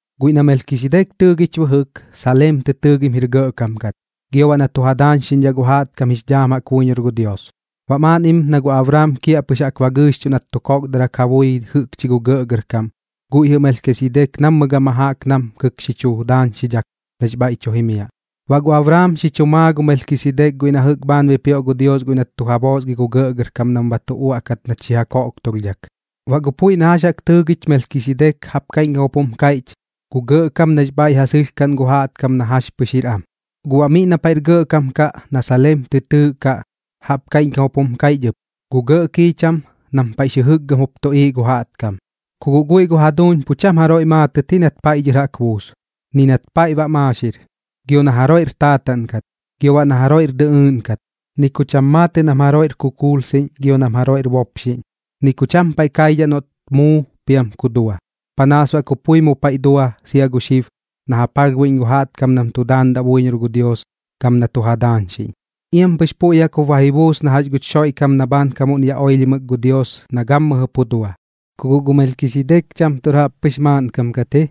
Guiꞌ na Melkisidek tɨɨgich bɨjɨk, Saleem tɨ tɨɨgim jir gɇꞌkam kat, gio baꞌ na tu ja daañxiꞌñdhaꞌ gu jaꞌtkam jix dhaam buiñor gu Dios. Baꞌ maaꞌnnim na gu Abraam kiaꞌpɨx jaꞌk ba gɨɨxchuꞌ nat tu kokdarak ja bui jɨꞌkchi gu gɇꞌgɇrkam, guiꞌ jɨꞌ Melkisidek nammɨ gama jaꞌk namkɨk xi chu daañxidhak nax bhaiꞌ tu jimiaꞌ. Baꞌ gu Abraam xi chu maa gu Melkisidek guiꞌ na jɨꞌk bhaan bipioꞌ gu Dios guiꞌ nat tu ja boosgi gu gɇꞌgɇrkam nam ba tu uaꞌkat nat xi ja koꞌktulhdhak. Baꞌ gu puiꞌ na jax tɨɨgich Melkisidek jaꞌp kaiꞌñkam jup jum kaiꞌch: Gu gɇꞌkam nax bhaiꞌ ja sɨlhkaꞌn gu jaꞌtkam na jax pɨx jir am. Guꞌ baꞌ miꞌ na paiꞌr gɇꞌkam kaꞌ na Saleem tɨ tɨɨꞌkaꞌ, jaꞌp kaiꞌñkam jup jum kaiꞌch ɨp: Gu gɇꞌ kiicham nam paiꞌx jɨkgɨm jup tuꞌiiꞌ gu jaꞌtkam. Ku guꞌ guiꞌ gu jaduuñ pu cham jaroiꞌ maatɨt ji nat paiꞌ dhɨr jaꞌk buus, ni nat paiꞌ ba maaxir, gio na jaroiꞌr taataꞌn kat, gio baꞌ na jaroiꞌr dɨꞌɨɨꞌn kat, ni ku cham maatɨꞌ nam jaroiꞌr kukuulsiꞌñ gio nam jaroiꞌr bopxiꞌñ. Ni ku cham paiꞌ kaidhaꞌ noꞌt muu piam ku dua. Panaas baꞌ ku pui mu paiꞌ dua sia gu xib na ja palhbuiꞌñ gu jaꞌtkam nam tu daandaꞌ buiñor gu Dios gam na tu ja daañxiꞌñ, iam pɨx puiꞌ jaꞌk jup ba ji buus na jax guch Xoiꞌkam na bhaankamuꞌn yaꞌ oilhimɨk gu Dios na gammɨjɨ pu dua. Ku guꞌ gu Melkisidek cham tuꞌr jaꞌppɨx maaꞌnkam kat ji,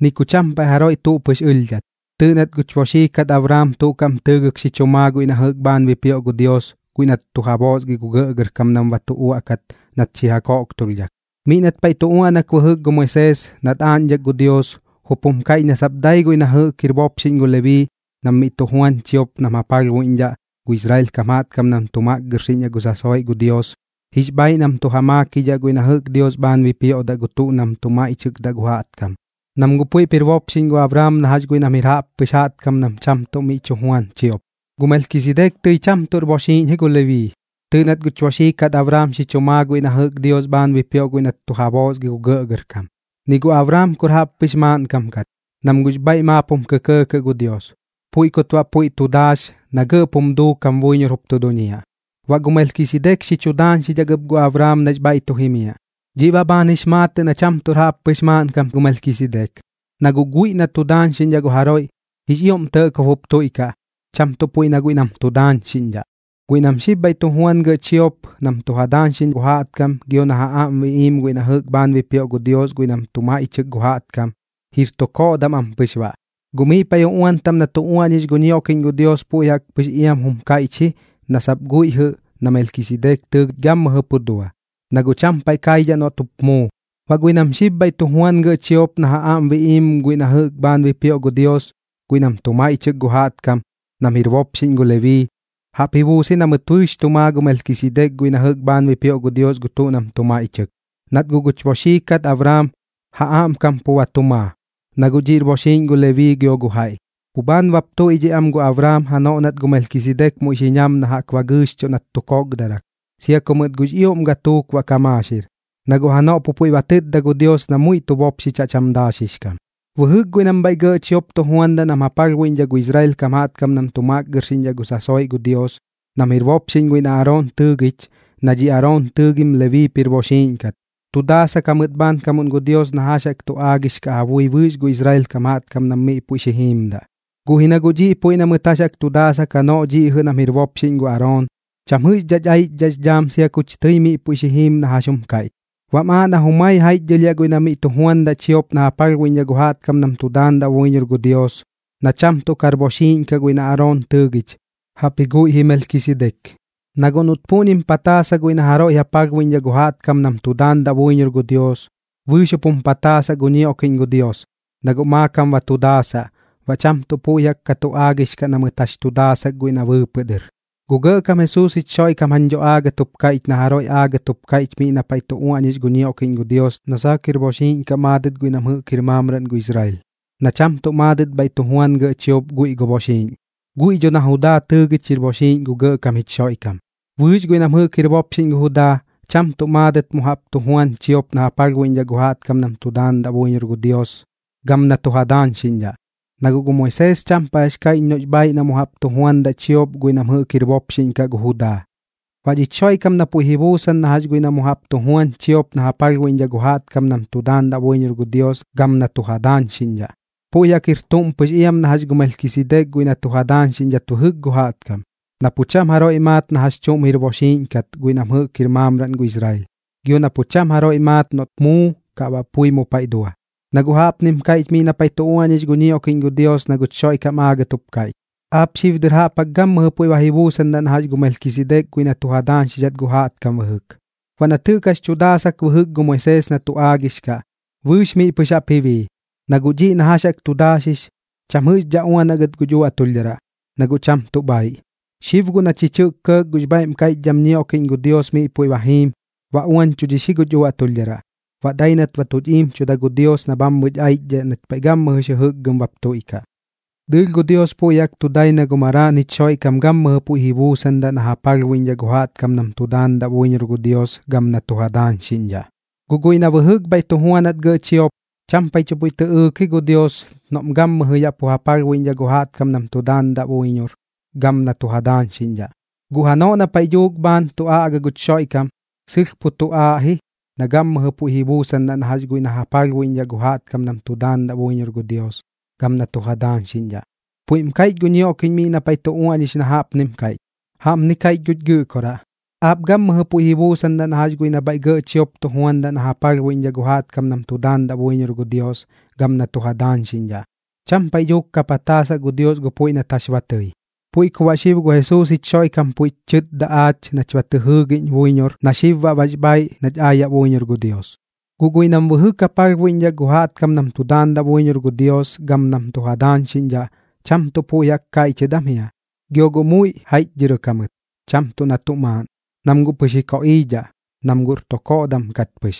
ni ku cham paiꞌ jaroiꞌ tuꞌ pɨx ɨlhdhat. Tɨɨꞌ nat guch boxii kat Abraam tuꞌ kaꞌm tɨɨgɨk xi chu maa guiꞌ na jɨꞌk bhaan bipioꞌ gu Dios guiꞌ nat tu ja boosgi gu gɇꞌgɇrkam nam ba tu uaꞌkat nat xi ja koꞌktulhdhak. Miꞌ nat paiꞌ tu uaꞌnak bɨjɨk gu Moisees nat aaꞌñdhak gu Dios, jup jum kaiꞌch na sap dai guiꞌ nam jɨꞌk jir bopxiꞌñ gu Lebii nam miꞌ tu juan chiop nam ja palhbuiꞌñdhaꞌ gu Israel kam jaꞌtkam nam tu makgɨrxiꞌñdhaꞌ gu sasoiꞌ gu Dios, jix bhaaiꞌ nam tu ja maakidhaꞌ guiꞌ na jɨꞌk Dios bhaan bipioꞌdaꞌ gu tuꞌ nam tu maiꞌchɨkdaꞌ gu jaꞌkam, nam guꞌ puiꞌp jir bopxiꞌñ gu Abraam na jax guiꞌ nam jir jaꞌppɨx jaꞌtkam nam cham tuꞌ miꞌ tu juan chiop. Guꞌ gu Melkisidek tɨi cham tuꞌr boxiiꞌñ ji gu Lebii. Tɨɨꞌ nat guch boxii kat Abraam xi chu maa guiꞌ na jɨꞌk Dios bhaan bipioꞌ guiꞌ nat tu ja boosgi gu gɇꞌgɇrkam. Ni gu Abraam kur jaꞌppɨx maaꞌnkam kat, nam guꞌx bhaiꞌ maap jum kɇkɇɇ gu Dios, puiꞌ kut baꞌ puiꞌ tu daax na gɇꞌp jum duukam buiñor jup tu duñiaꞌ. Baꞌ gu Melkisidek xi chu daañxidhak ɨp gu Abraam nax bhaiꞌ tu jimiaꞌ. Dhiꞌ baꞌ bhaan jix maatɨꞌ na cham tuꞌr jaꞌppɨx maaꞌnkam gu Melkisidek. Na guꞌ guiꞌ na tu daañxiꞌñdhaꞌ gu jaroiꞌ, jix ioꞌm tɇꞌkob jup tuiꞌkaꞌ, cham tuꞌ puiꞌ na guiꞌ nam tu daañxiꞌñdhaꞌ. Guiꞌ nam xib bhaiꞌ tu juan gɇꞌ chiop nam tu ja daañxiꞌñ gu jaꞌtkam gio na ja aꞌm biꞌiim guiꞌ na jɨꞌk bhaan bipioꞌ gu Dios guiꞌ nam tu maiꞌchɨk gu jaꞌtkam, jir tu koꞌdam am pɨx baꞌ. Guꞌ miꞌ paiꞌ uꞌuan taꞌm na tu uaꞌñix gu ñioꞌkiꞌñ gu Dios puiꞌ jaꞌk pɨx iam jum kaiꞌch ji na sap guiꞌ jɨꞌ na Melkisidek tɨɨꞌ gammɨjɨ pu dua, na guꞌ cham paiꞌ kaidhaꞌ noꞌt jup muu. Baꞌ guiꞌ nam xib bhaiꞌ tu juan gɇꞌ chiop na ja aꞌm biꞌiim guiꞌ na jɨꞌk bhaan bipioꞌ gu Dios guiꞌ nam tu maiꞌchɨk gu jaꞌtkam, nam jir bopxiꞌñ gu Lebii, jaꞌp ji buus ji na mɨt bɨɨx tu maa gu Melkisidek guiꞌ na jɨꞌk bhaan bipioꞌ gu Dios gu tuꞌ nam tu maiꞌchɨk, nat guꞌ guch boxii kat Abraam ja aꞌmkam pu ba tu maa, na guꞌ dhiꞌr boxiiꞌñ gu Lebii gio gu jaiꞌ. Pu bhaan bap tuiꞌdhiꞌ am gu Abraam janoꞌ nat gu Melkisidek muiꞌ xi ñam na jaꞌk ba gɨɨxchuꞌ nat tu kokdarak, sia ku mɨt guꞌx ioꞌm gatuuk baꞌ ka maaxir, na guꞌ janoꞌ pu puiꞌ ba tɨtda gu Dios na muiꞌ tu bopxichaꞌ cham daaxix kam. Bɨjɨk guiꞌ nam bhaiꞌ gɇꞌ chiop tu juandaꞌ nam ja palhbuiꞌñdhaꞌ gu Israel kam jaꞌtkam nam tu makgɨrxiꞌñdhaꞌ gu sasoiꞌ gu Dios, nam jir bopxiꞌñ guiꞌ na Aroon tɨɨgich, na dhi Aroon tɨɨgim Lebiip jir boxiiꞌñ kat, tu daasak jamɨt bhaankamuꞌn gu Dios na jax jaꞌk tu aagix kaꞌ ja bui bɨɨx gu Israel kam jaꞌtkam nam miꞌ puiꞌ xi jiimdaꞌ. Guꞌ ji na guꞌ dhiꞌ puiꞌ na mɨt jax tu daasak janoꞌ dhiꞌ jɨꞌ nam jir bopxiꞌñ gu Aroon, cham jɨꞌxdhaꞌch aichdhaꞌx dhaam sia kuch tɨi miꞌ puiꞌ xi jiim na jax jum kaiꞌch. Baꞌm aaꞌ na jumai jaiꞌchdhɨlhiaꞌ guiꞌ na miꞌ tu juandaꞌ chiop na ja palhbuiꞌñdhaꞌ gu jaꞌtkam nam tu daandaꞌ buiñor gu Dios, na cham tuꞌ kar boxiiꞌñ kaꞌ guiꞌ na Aroon tɨɨgich, jaꞌpji guiꞌ ji Melkisidek. Na guꞌ noꞌt puꞌñim pataasa guiꞌ na jaroiꞌ ja palhbuiꞌñdhaꞌ gu jaꞌtkam nam tu daandaꞌ buiñor gu Dios, bɨɨx jup jum pataasaꞌ gu ñioꞌkiꞌñ gu Dios, na guꞌ maakam ba tu daasaꞌ, baꞌ cham tuꞌ puiꞌ jaꞌk ka tu aagix kaꞌ na mɨt jax tu daasak guiꞌ na bɨɨpɨꞌ dɨr. Gu Gɇꞌkam Jesuus jich Xoiꞌkam jañ dho aagɨt jup kaiꞌch na jaroiꞌ aagɨt jup kaiꞌch miꞌ na paiꞌ tu uaꞌñix gu ñioꞌkiꞌñ gu Dios na saak jir boxiiꞌñ kaꞌ maadɨt guiꞌ nam jɨꞌk jir maamraꞌn gu Israel, na cham tuꞌ maadɨt bhaiꞌ tu juan gɇꞌ chiop guiꞌ gu bopxiꞌñ. Guiꞌ dho na Judaa tɨɨgich jir boxiiꞌñ gu Gɇꞌkam jich Xoiꞌkam. Bɨɨx guiꞌ nam jɨꞌk jir bopxiꞌñ gu Judaa, cham tuꞌ maadɨt mu jaꞌp tu juan chiop na ja palhbuiꞌñdhaꞌ gu jaꞌtkam nam tu daandaꞌ buiñor gu Dios gam na tu ja daañxiꞌñdhaꞌ, na guꞌ gu Moisees cham paiꞌ jax kaiꞌch noꞌx bhaaiꞌ nam mu jaꞌp tu juandaꞌ chiop guiꞌ nam jɨꞌk jir bopxiꞌñ kaꞌ gu Judaa. Baꞌ dhich Xoiꞌkam na puiꞌ ji buusan na jax guiꞌ na mu jaꞌp tu juan chiop na ja palhbuiꞌñdhaꞌ gu jaꞌtkam nam tu daandaꞌ buiñor gu Dios gam na tu ja daañxiꞌñdhaꞌ, puiꞌ jaꞌk jir tuꞌm pɨx iam na jax gu Melkisidek guiꞌ na tu ja daañxidhat bɨjɨk gu jaꞌtkam, na pu cham jaroiꞌ maat na jax chuꞌm jir boxiiꞌñ kat guiꞌ nam jɨꞌk jir maamraꞌn gu Israel, gio na pu cham jaroiꞌ maat noꞌt muu, kaꞌ baꞌ pui mu paiꞌ dua. Na guꞌ jaꞌpnim kaiꞌch miꞌ na paiꞌ tu uaꞌñix gu ñioꞌkiꞌñ gu Dios na guch Xoiꞌkam aagɨt jup kaiꞌch: Aap xib dɨr jaꞌp jaꞌk gammɨjɨ puiꞌ ba ji buusandaꞌ na jax gu Melkisidek guiꞌ na tu ja daañxidhat gu jaꞌtkam bɨjɨk. Baꞌ nat jɨꞌk jax chu daasak bɨjɨk gu Moisees na tu aagix kaꞌ, bɨɨx miꞌ pɨx jaꞌp ji bii. Na guꞌ dhiꞌ na jax jaꞌk tu daaxix, cham jɨꞌxdhaꞌ uanaꞌ gɨt guch uaꞌtulhdharaꞌ, na guꞌ cham tuꞌ bhaaiꞌ. Xib guꞌ na chich jɨꞌk kɇɇk gux bhaiꞌm kaiꞌchdham ñioꞌkiꞌñ gu Dios miꞌ puiꞌ ba jiim, ba uañchudhix ji guch uaꞌtulhdharaꞌ, baꞌ dai nat ba tuch iimchuda gu Dios na bhammɨch aichdhaꞌ nach paiꞌ gammɨjɨx jɨjɨkgɨm bap tuiꞌkaꞌ. Dɨɨlh gu Dios puiꞌ jaꞌk tu dai na gu Maraaꞌn jich Xoiꞌkam gammɨjɨ puiꞌ ji buusandaꞌ na ja palhbuiꞌñdhaꞌ gu jaꞌtkam nam tu daandaꞌ buiñor gu Dios gam na tu ja daañxiꞌñdhaꞌ. Guꞌ guiꞌ nam bɨjɨk bhaiꞌ tu juanat gɇꞌ chiop, cham paiꞌ tuꞌ puiꞌ tɨꞌɨɨk ji gu Dios noꞌm gammɨjɨ yaꞌ pu ja palhbuiꞌñdhaꞌ gu jaꞌtkam nam tu daandaꞌ buiñor gam nam tu ja daañxiꞌñdhaꞌ. Guꞌ janoꞌ na paiꞌ dhuuk bhaan tu aꞌga guch Xoiꞌkam, sɨlh pu tu aaꞌ ji na gammɨjɨ puiꞌ ji buusandaꞌ na jax guiꞌ na ja palhbuiꞌñdhaꞌ gu jaꞌtkam nam tu daandaꞌ buiñor gu Dios gam na tu ja daañxiꞌñdhaꞌ. Puiꞌm kaiꞌch gu ñioꞌkiꞌñ miꞌ na paiꞌ tu uaꞌñix na jaꞌpnim kaiꞌch: Jaꞌpni kaiꞌch guch Gɨꞌkoraꞌ: “Aap gammɨjɨ puiꞌ ji buusandaꞌ na jax guiꞌ nam bhaiꞌ gɇꞌ chiop tu juandaꞌ nam ja palhbuiꞌñdhaꞌ gu jaꞌtkam nam tu daandaꞌ buiñor gu Dios gam nam tu ja daañxiꞌñdhaꞌ.” Cham paiꞌ dhuuk ka pataasaꞌ gu Dios gu puiꞌ nat jax ba tɨi. Puiꞌ ku baꞌ xib gu Jesuus jich Xoiꞌkam puiꞌch chɨtda aach nach ba tɨ jɨɨgiꞌñ buiñor na xib baꞌ bax bhaaiꞌ nach aayaꞌ buiñor gu Dios. Guꞌ guiꞌ nam bɨjɨk ja palhbuiꞌñdhaꞌ gu jaꞌtkam nam tu daandaꞌ buiñor gu Dios gam nam tu ja daañxiꞌñdhaꞌ, cham tuꞌ puiꞌ jaꞌk kaiꞌchɨt am jia, gio gu muiꞌ jaiꞌchdhɨrɨk jamɨt, cham tuꞌ na tuꞌ maaꞌn, nam guꞌ pɨx ji koꞌiidhaꞌ, nam guꞌr tu koꞌdam kat pɨx.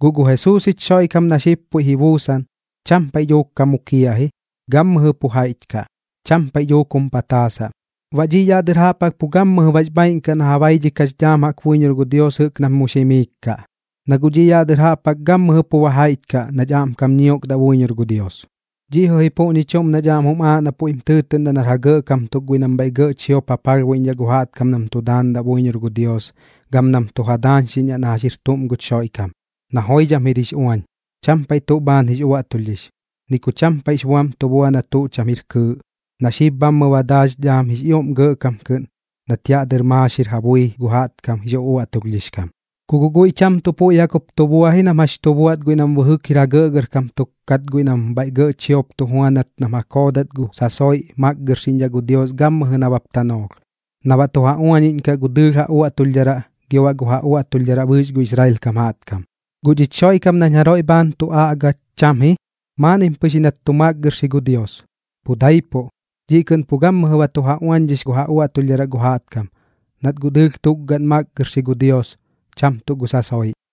Guꞌ gu Jesuus jich Xoiꞌkam na xib puiꞌp ji buusan, cham paiꞌ dhuuk ka mukiaꞌ ji, gammɨjɨ pu jaiꞌch kaꞌ, cham paiꞌ dhuuk jum pataasaꞌ. Baꞌ dhiꞌ yaꞌ dɨr jaꞌp jaꞌk pu gammɨjɨ bax bhaaiꞌn kaꞌ na ja baidhikaꞌx dhaam buiñor gu Dios jɨꞌk nam mux jimiik kaꞌ, na guꞌ dhiꞌ yaꞌ dɨr jaꞌp jaꞌk gammɨjɨ pu ba jaiꞌch kaꞌ, nach aꞌmkam ñiokdaꞌ buiñor gu Dios. Dhiꞌ jɨꞌ ji puꞌñi chuꞌm nach aꞌm jum aaꞌ na puiꞌm tɨɨtɨꞌndaꞌ nar ja gɇꞌkam tuk guiꞌ nam bhaiꞌ gɇꞌ chiop ja palhbuiꞌñdhaꞌ gu jaꞌtkam nam tu daandaꞌ buiñor gu Dios gam nam tu ja daañxiꞌñdhaꞌ na jax jir tuꞌm guch Xoiꞌkam, na joidham jir jix uañ, cham paiꞌ tuꞌ bhaan jix uaꞌtulhdhix, ni ku cham paiꞌx buam tu bua na tuꞌ cham jir kɨɨꞌ, na xib bhammɨ ba daax dhaam jix ioꞌm Gɇꞌkam kɨꞌn nat yaꞌ dɨr maaxir ja bui gu jaꞌtkam jix uꞌuaꞌtulhdhix kam. Ku guꞌ guiꞌ cham tuꞌ puiꞌ jaꞌk jup tu bua ji nam jax chu buaꞌt guiꞌ nam bɨjɨk jir ja gɇꞌgɇrkam tuk kat guiꞌ nam bhaiꞌ gɇꞌ chiop tu juanat nam ja koodat gu sasoiꞌ makgɨrxiꞌñdhaꞌ gu Dios gammɨjɨ nabap tanoolh, na baꞌ tu ja uañiꞌñkaꞌ gu dɨɨlh ja uaꞌtulhdharaꞌ gio baꞌ gu ja uaꞌtulhdharaꞌ bɨɨx gu Israel kam jaꞌtkam. Guꞌ dhich Xoiꞌkam nañ jaroiꞌ bhaan tu aꞌga cham ji, maaꞌnnim pɨx ji nat tu makgɨrxi gu Dios, pu daipuꞌ. Dhiꞌ kɨꞌn pu gammɨjɨ ba tu ja uañdhix gu ja uaꞌtulhdharaꞌ gu jaꞌtkam, nat guꞌ dɨɨlh tukgaꞌn makgɨrxi gu Dios, cham tuꞌ gu sasoiꞌ.